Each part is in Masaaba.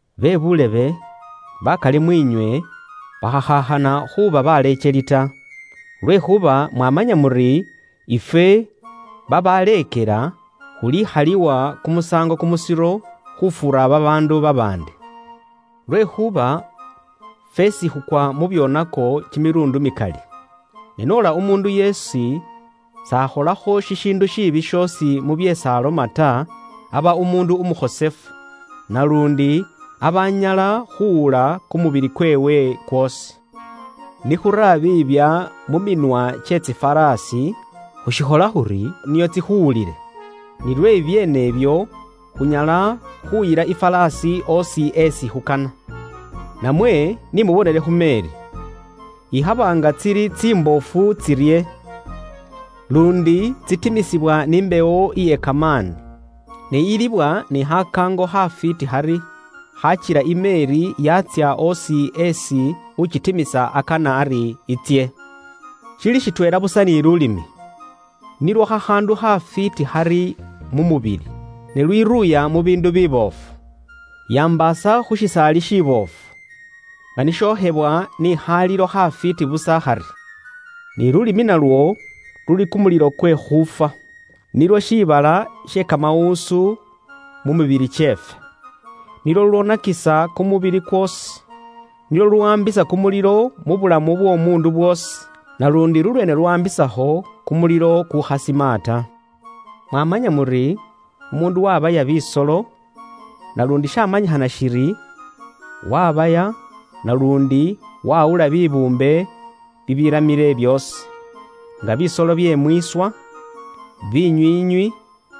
Bebuulebe, bakali mwiinywe bakhakhaakhana khuuba baleekeli ta, lwekhuuba mwamanya muri ifwe babaleekela, khulikhalilwa kumusaango kumusiro, khufuura babaandu babaandi. Lwekhuuba fweesi khukwa mu byoonako kimiluundi mikali. Ne noola umuundu yeesi s'akholakho shishiindu shiibi shoosi mu byeesi aloma ta, aba umuundu umukhosefu, naluundi aba anyala khuwula kumubili kweewe kwoosi. Ni khura biibya mu minwa kye tsiŋwaaŋwa, khushikhola khuri nio tsikhuwulile, ni lwe bibyeene ibyo, khunyala khuyila iŋwaaŋwa oosi isi khukana. Namwe ni mubonele khu meeri. Ikhaba nga tsili tsimboofu tsirye, luundi tsitimisibwa ni mbewo iye kamaani, ne iyilibwa ni khakaango khafwiiti khari, khakila imeeri yaatsya osi esi ukitimisa akana ari itsye. Shili shitweela busa ni luulimi. Nilwo khakhaandu khafwiiti khari mu mubili, ne lwiruuya mu biindu biboofu. Yambaasa khu shisaali shiboofu, nga ni shokhewa ni khaalilo khafwiiti busa khari. Ni luulimi nilwo lulureere bye bubwoonaki mu baandu basheefwe. Nilwo shiibala she kamawuusu mu mibili kyeefwe. Nilwo lulwoonakisa kumubili kwoosi. Nilwo luluwaambisa kumulilo mu bulamu bw'omuundu bwoosi, naluundi lulweene luuwaambisakho kumulilo kukukhasima ta. Mwamanya muri, umuundu waabaya, naluundi shaamanyikhana shiri, waabaya naluundi waawula bibuumbe bibiramile byoosi; nga bisolo bye mwiiswa, binywiinywi,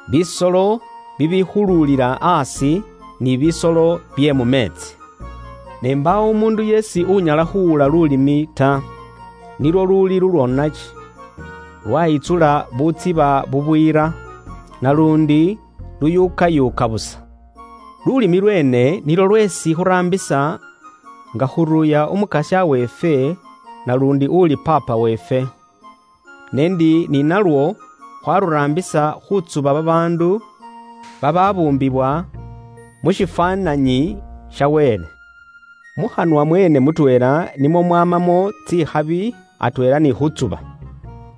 bisolo bibikhuluulila aasi, ni bisolo bye mu meetsi. Ne mbaawo umuundu yeesi unyala khuuwula luulimi ta. Nilwo luli lulwoonaki, lwaayitsula butsiba bubwiira, naluundi luyuukayuuka busa. Luulimi lweene nilwo lweesi khuraambisa nga khuruuya Umukasya weefwe naluundi uli Paapa weefwe; ne ndi ni nalwo khwaluraambisa khutsuba babaandu babaabuumbiwa mu shifwaananyi sha Wele. Mukhanwa mweene mutweela nimwo mumwamamo tsikhabi atweela ni khuutsuba.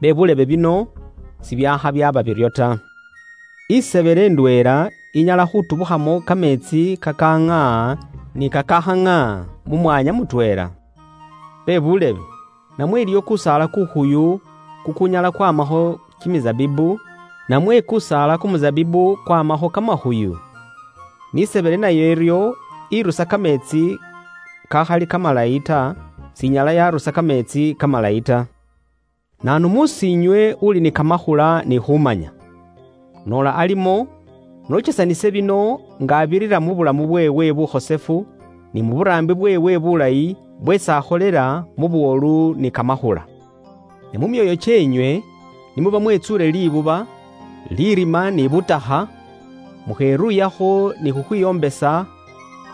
Bebuulebe, bino sibyaakha byaaba biryo ta. Isebele ndweela inyala khuutubukhamo kameetsi kakaŋaaha ni kakakhaŋaaha mu mwanya mutweela? Bebuulebe, namwe iliwo kusaala ku figi kukunyala kwaamakho kimisabibu, namwe kusaala kumusabibu kwaamakho kamakhuyu? N'isebele naye iryo, irusa kameetsi kakhali kamalayi ta, s'inyala yarusa kameetsi kamalayi ta. Naanu mus'iinywe uuli ni kamakhula ni khuumanya? Noola alimo, n'okesanise bino nga abirira mu saambo indayi iye buulamu bweewe bukhosefu ni mu buraambi bweewe bulayi bweesi akholela mu buwolu ni kamakhula. Ne mu myoyo kyeenywe ni muba mwetsuule libuba, lirima ni butakha, mukheruuyakho ni khukhwiwombesa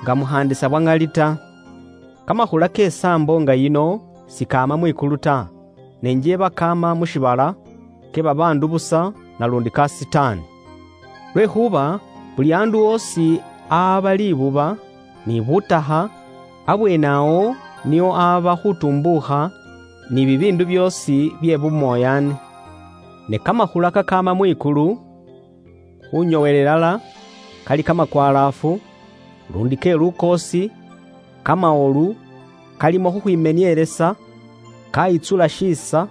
nga mukhaandisa bwa ŋali ta. Kamakhula ke saambo nga yino sikaama mwikulu ta, ne njeeba kaama mu shiibala, ke babaandu busa naluundi ka kimimakoombe. Lwekhuuba buli aandu oosi ahaaba libuba, ni butakha, abweene awo niwo ahaaba khuutumbuukha ni bibiindu byoosi bye bumoyaani. Ne kamakhula kakaama mwikulu, khunyoowela ilala, kali ka ŋali nga si kalikho lisaanda ta, luundi ke lukoosi, kamawolu, kalimo khukhwimenielesa, kaayiitsula shiisa,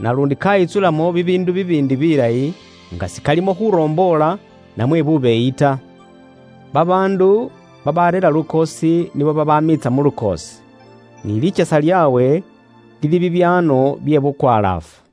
naluundi kaayiitsulamo bibiindu bibiindi bilayi, nga sikalimo khuromboola namwe bubeeyi ta. Babaandu babareera lukoosi nibo babamiitsa mu lukoosi, ni likyesa lyaabwe lili bibyaano bye bukwalaafu.